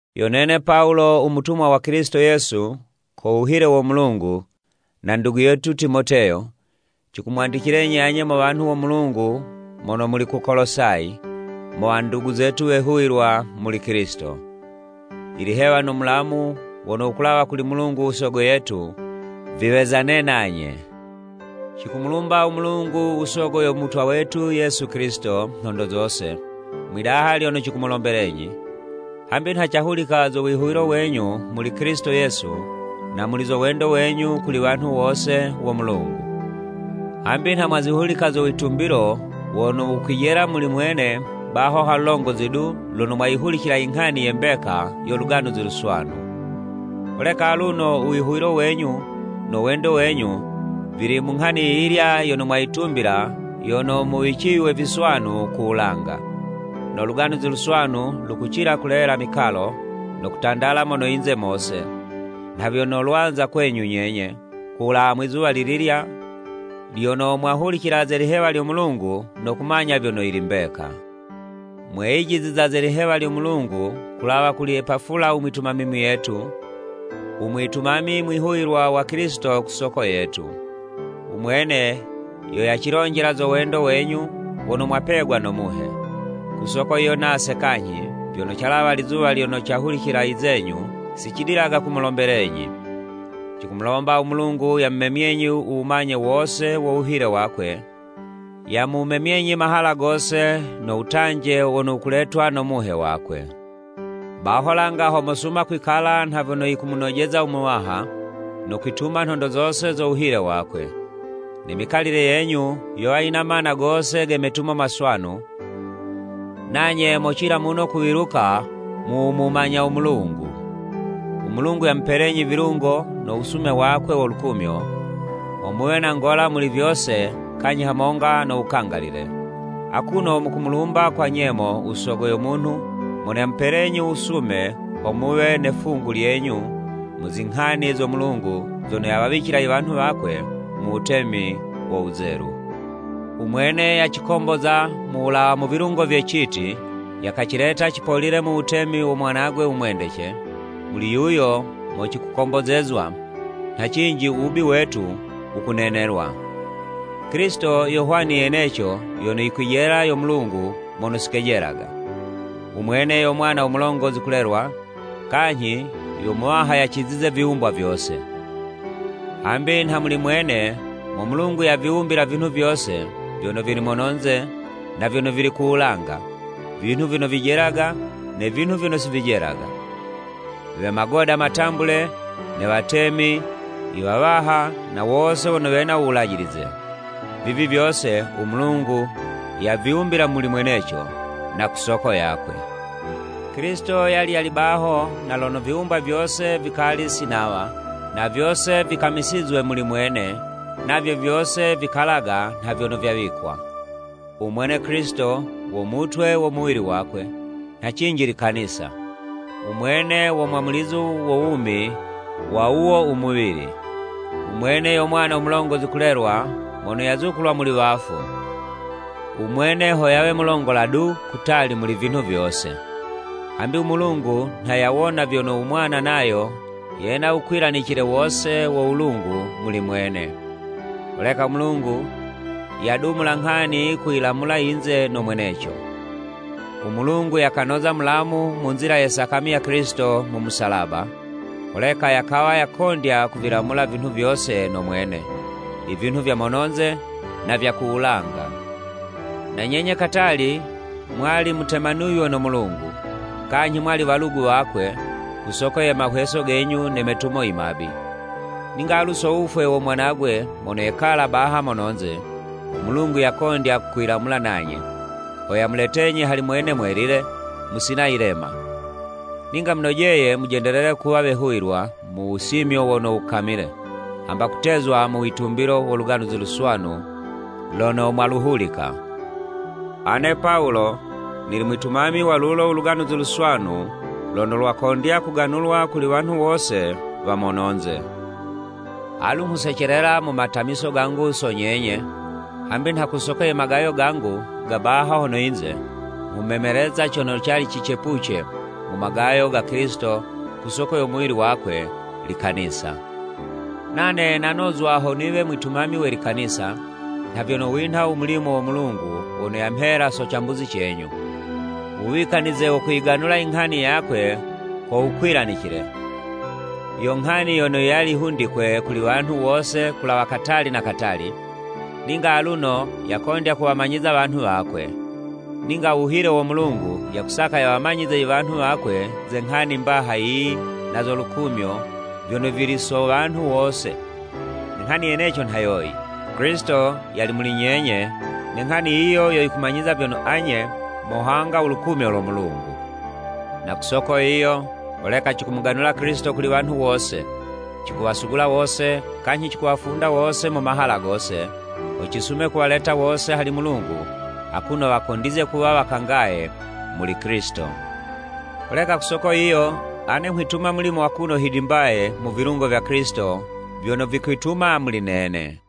Yo nene Pawulo u mutumwa wa Kilisito Yesu ko wuhile wo Mulungu, na ndugu yetu Timoteyo, cikumwandicilenyi anye mo wanhu wo Mulungu mono muli ku Kolosayi, mo wandugu zetu wehuwilwa muli Kilisito. Ilihewa no mulamu wono wukulawa kuli Mulungu u Sogo yetu viwezane nanye. Cikumulumba u Mulungu u sogo yo Mutwa wetu Yesu Kilisito, nhondo zose, mwi'daha lyono cikumulombelenyi. Hambi nha cahulika zo wihuwilo wenyu muli Kilisito Yesu na muli zo wendo wenyu kuli wanhu wose wo Mulungu. Hambi nha mwazihulika zo witumbilo, wono wukwijela muli mwene baho ha lulongozi du, lono mwayihulicila inghani ye mbeka yo Luganuzi Luswanu. Holeka aluno u wihuwilo wenyu, no wendo wenyu, vili mu nghani yiyilya yono mwayitumbila yono muwiciywe viswanu ku wulanga. No Luganuzi Luswanu, lukucila kulela mikalo, no kutandala mono yinze mose, nha vyono lwaza kwenyu nyenye, ku wulawa mwi'zuwa lililya lyono mwahulicila ze lihewa lyo Mulungu no kumanya vyono yili mbeka. Mweyijiza ze lihewa lyo Mulungu kulawa kuli Epafula u mwitumami muyetu, u mwitumami mwihuwilwa wa Kilisito ku soko yetu. U mwene yo yacilonjela zo wendo wenyu wono mwapegwa no Muhe. Ku soko yiyo nase kanyhi, vyono calawa lizuwa lyono cahulicila i zenyu, si cidilaga kumulombelenyi. Cikumulomba u Mulungu yamumemyenyi u wumanye wose wo wuhile wakwe, yamumemyenyi mahala gose no wutanje wono wukuletwa no Muhe wakwe. Baho langa ho mosuma kwikala nha vyono yikumunojeza u Muwaha, no kwituma nhondo zose zo wuhile wakwe. Ne mikalile yenyu yowa yina mana gose ge metumo maswanu, nanye mocila muno kuwiluka mu wu mumanya u Mulungu. U Mulungu yamupelenyi vilungo no wusume wakwe wo lukumyo, ho muwe na ngola muli vyose kanyhi hamonga no wukangalile. Akuno mukumulumba kwa nyemo u Sogo yo munhu mono yamupelenyi u wusume ho muwe ne 'fungu lyenyu mu zinghani zo Mulungu zono yawawicila i wanhu wakwe mu wutemi wo wuzelu. U Mwene yacikomboza mu wulawa mu vilungo vye citi, yakacileta cipolile mu wutemi wo Mwanagwe u mwendece, muli yuyo mo cikukombozezwa, nha cinji u wubi wetu wukunenelwa. Kilisito yo hwani yeneco yono yikwijela yo Mulungu mono si kejelaga. U mwene yo Mwana u mulongozi kulelwa, kanyhi yo muwaha yacizize viwumbwa vyose. Hambi nha muli mwene mo Mulungu yaviwumbila vinhu vyose vyono vili mono yinze na vyono vili ku wulanga, vinhu vyono vijelaga ne vinhu vyono si vijelaga, we magoda matambule, ne Watemi, i Wawaha na wose wono wena u wulajilize. Vivi vyose u Mulungu yaviwumbila muli mweneco, na ku soko yakwe. Kilisito yali yali baho na lono viwumbwa vyose vikali si nawa, na vyose vikamisizwe muli mwene, navyo vyose vikalaga nha vyono vyawikwa. U Mwene Kilisito wo mutwe wo muwili wakwe, nha cinji likanisa, u Mwene wo mwamulizo wo wumi wa wuwo umuwili. U Mwene yo Mwana mulongozi kulelwa mono yazukulwa muli wafu, u Mwene ho yawe mulongola du kutali muli vinhu vyose. Hambi u Mulungu nha yawona vyono u Mwana nayo yena u wukwilanicile wose wo wulungu muli mwene. Holeka u Mulungu yadumula nghani kuyilamula yinze no mweneco. U Mulungu yakanoza mulamu mu nzila ye sakami ya Kilisito mu musalaba, holeka yakawa yakondya kuvilamula vinhu vyose no mwene, ivinhu vya mono'nze na vya ku wulanga. Na nyenye katali mwali mutemanuywe no Mulungu, kanyhi mwali walugu wakwe ku soko ye mahweso genyu ne metumo i mabi. Ninga alu so wufwe wo Mwanagwe mono yekala baha mono'nze, u Mulungu yakondya kwilamula nanye, ho yamuletenyi hali mwene mwelile, musina yilema. Ninga munojeye mujendelele kuwa wehuwilwa mu wusimyo wono wukamile, hamba kutezwa mu witumbilo wo Luganuzi Luswanu lono mwaluhulika. Ane Pawulo nili mwitumami wa lulo u Luganuzi Luswanu lono lwakondya kuganulwa kuli wanhu wose wa mono'nze. Alu nghusecelela mu matamiso gangu so nyenye, hambi nha ku soko ye magayo gangu ga baha hono yinze, nghumemeleza cono cali cicepuce mu magayo ga Kilisito ku soko yo muwili wakwe, likanisa. Nane nanozwa ho niwe mwitumami we likanisa, nha vyono winha u mulimo wo Mulungu wono yamhela so cambuzi cenyu, wuwikanize wo kuyiganula inghani yakwe ko wukwilanicile, yo nghani yono yali hundikwe kuli wanhu wose kulawa katali na katali, ninga aluno yakondya kuwamanyiza wanhu wakwe. Ninga u wuhile wo Mulungu, yakusaka yawamanyize i wanhu wakwe ze nghani mbaha yiyi na zo lukumyo, vyono vili so wanhu wose. Ne nghani yeneco nha yoyi: Kilisito yali muli nyenye, ne nghani yiyo yo yikumanyiza vyono anye mohanga u lukumyo lo Mulungu. Na ku soko yiyo, holeka cikumuganula Kilisito kuli wanhu wose, cikuwasugula wose kanyhi cikuwafunda wose mu mahala gose, ho cisume kuwaleta wose hali Mulungu akuno wakondizye kuwa wakangaye muli Kilisito. Holeka ku soko yiyo, ane nghwituma mulimo akuno hidimbaye mu vilungo vya Kilisito vyono vikwituma muli nene.